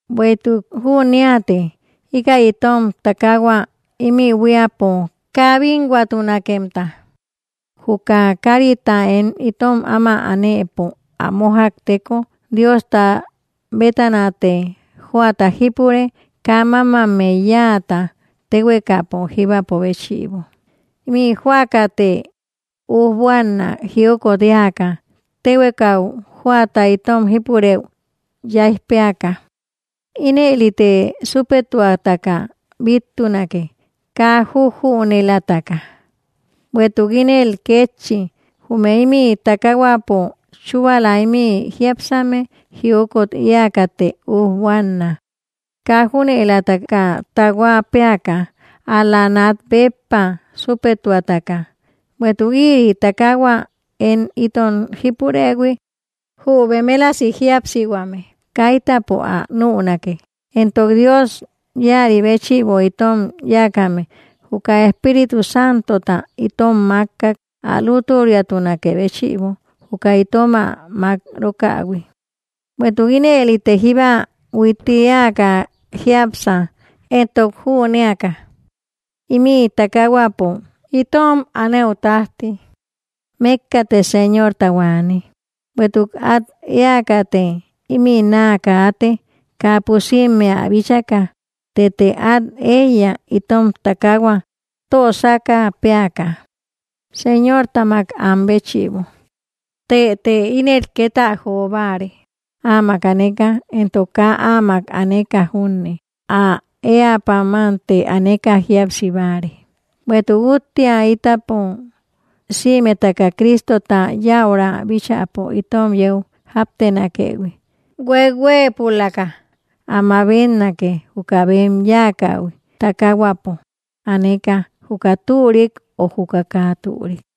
Bueïtuk jüneate íkäi itom takahua imï buíapo kaa bínnhuatunakemta juka karita én itom áma anëpo ä mójakteko, Diosta bétanate jóata jípure, kaa mamammey yáata, téhuekapo jibäpo béchïbo. Imï joakate ujbuana jiokot eäka, tehuekau joata itom jípureü yaij péaka; inëlite supetuataka bittunake kaa jujünëlaka. Bueïtuk ínëli kétchi, jume imï tákahuäpo chubala imï jiápsame, jiokot eäkate ujbuanna; kaa jujünëlaka taahua péaka, ál-la nat béppa supetuataka, bueïtuk ïri takahua én itom jipurëhui jü bemelasi jíapsihuame kaitäpo ä nünake. Entok Dios íäri béchïbo itom yáakame, juka Espíritu Santota itom makkak ä lútüriatunakë béchïbo juka itom ä mak‑rokähui. Bueïtuk inëlite jíba huitti eäka jiápsa, entok jünéaka imï takahuäpo itom aneu tajti, mekkate señortau aane, bueïtuk at eäkate imï naa kaate kaa pusimmea ä bíchaka. Tëte át eiya, itom takahua tösaka péaka, Señortamak an béchïbo tëte ínen ket ä jobáare, áamak aneka entok kaa áamak aneka junne, ä éä pamante aneka jíapsibare. Bueïtuk úttia itapo sïmetaka Cristota yäura bíchäpo itom yeu jáptenakëhui, huehuëpulaka ä mabetnake juka bem yáakähui, takahuäpo aneka juka türik ö juka kaa türik.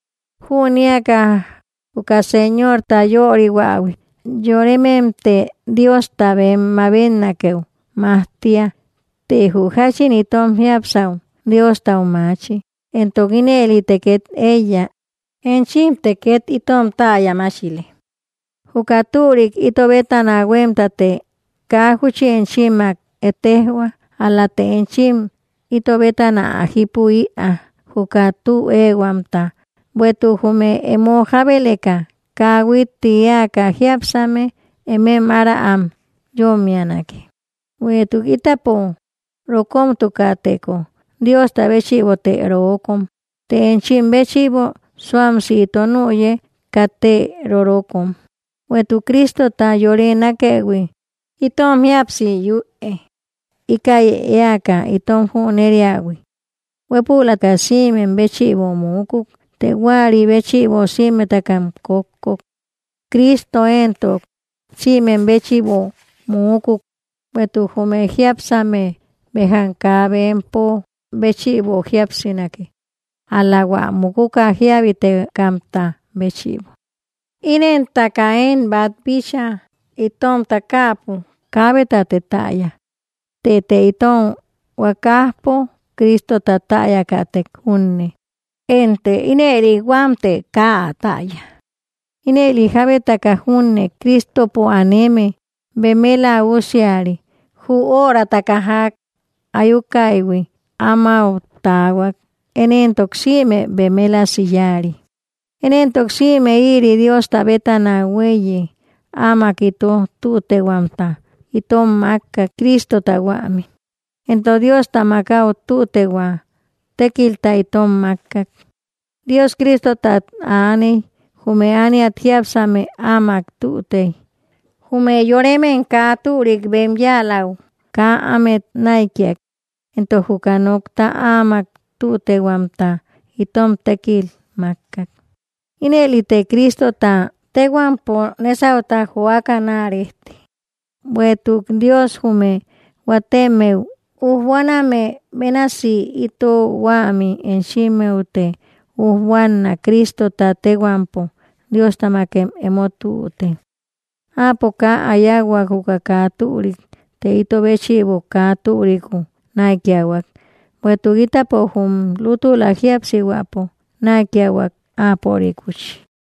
Jüneaka juka Señorta yörihuähui, yorememte Diosta bem mabetnakëu majtia, të jü jáchin itom jiápsau Diostau maachi, entok ínëline ket eiya. Enchimte ket itom täya machile. Juka türik ito bétana huemtate kaa júchi enchimmak ettejoa, ál-late enchim ito bétana ä jipü-ia juka tü ehuamta, bueïtuk jume emo jabeleka kaa huitti eäka jiápsame emem ára am yommianake. Bueïtuk itapo rokomtukäteko Diosta béchïbote rookom, të enchim béchïbo suamsi ito nüye katte rorokom. Bueïtuk Cristota yore nákëhui itom jíapsi yüe, íkäi eäka itom jüneriähui: huepuläka sïmem béchïbo múkuk, të juäri béchïbo sïmetakam kókkok. Cristo entok sïmem béchïbo múkuk, bueïtuk jume jiápsame, bejam kaa bempo béchïbo jíapsinake, ál-la hua mukuka jiabitekamta béchïbo. Inentaka én bat bíchaa itom takaapo kabetate täya, Tëte itom huakajpo Cristota täyakätek junne, ente ínëli huamte kaa ä täya. Ínëli jabetaka junne Cristopo aneme, beméla úsiari, jü örataka jak ayukaïhui amáu tahuak én entok sïme bemelasi yáari. Én entok sïme ïri Diosta bétana hueíye, áamak ito tütehuamta itom makkak Cristota huämi, entok Diostamak au tütehua tekilta itom makkak. Dios, Cristotat aaney jume ániat jiápsame áamak tütey, jume yoremem kaa türik bem yáalaü kaa ámet naïkiak, entok juka nokta áamak tütehuamta itom tekil makkak. Inëlite Cristota téhuampo nesauta joaka naa rejte, bueïtuk Dios jume huatemmeu ujbuaname bénasi ito huämi, enchimmeute ujbuanna Cristota téhuampo: Dióstamakem emo tüte. Áapo kaa ä yauhuak juka kaa türik, të ito béchïbo kaa türiku naïkiahuak, bueïtuk itapo jum lútula jíapsihuäpo naïkiahuak, áporikuchi.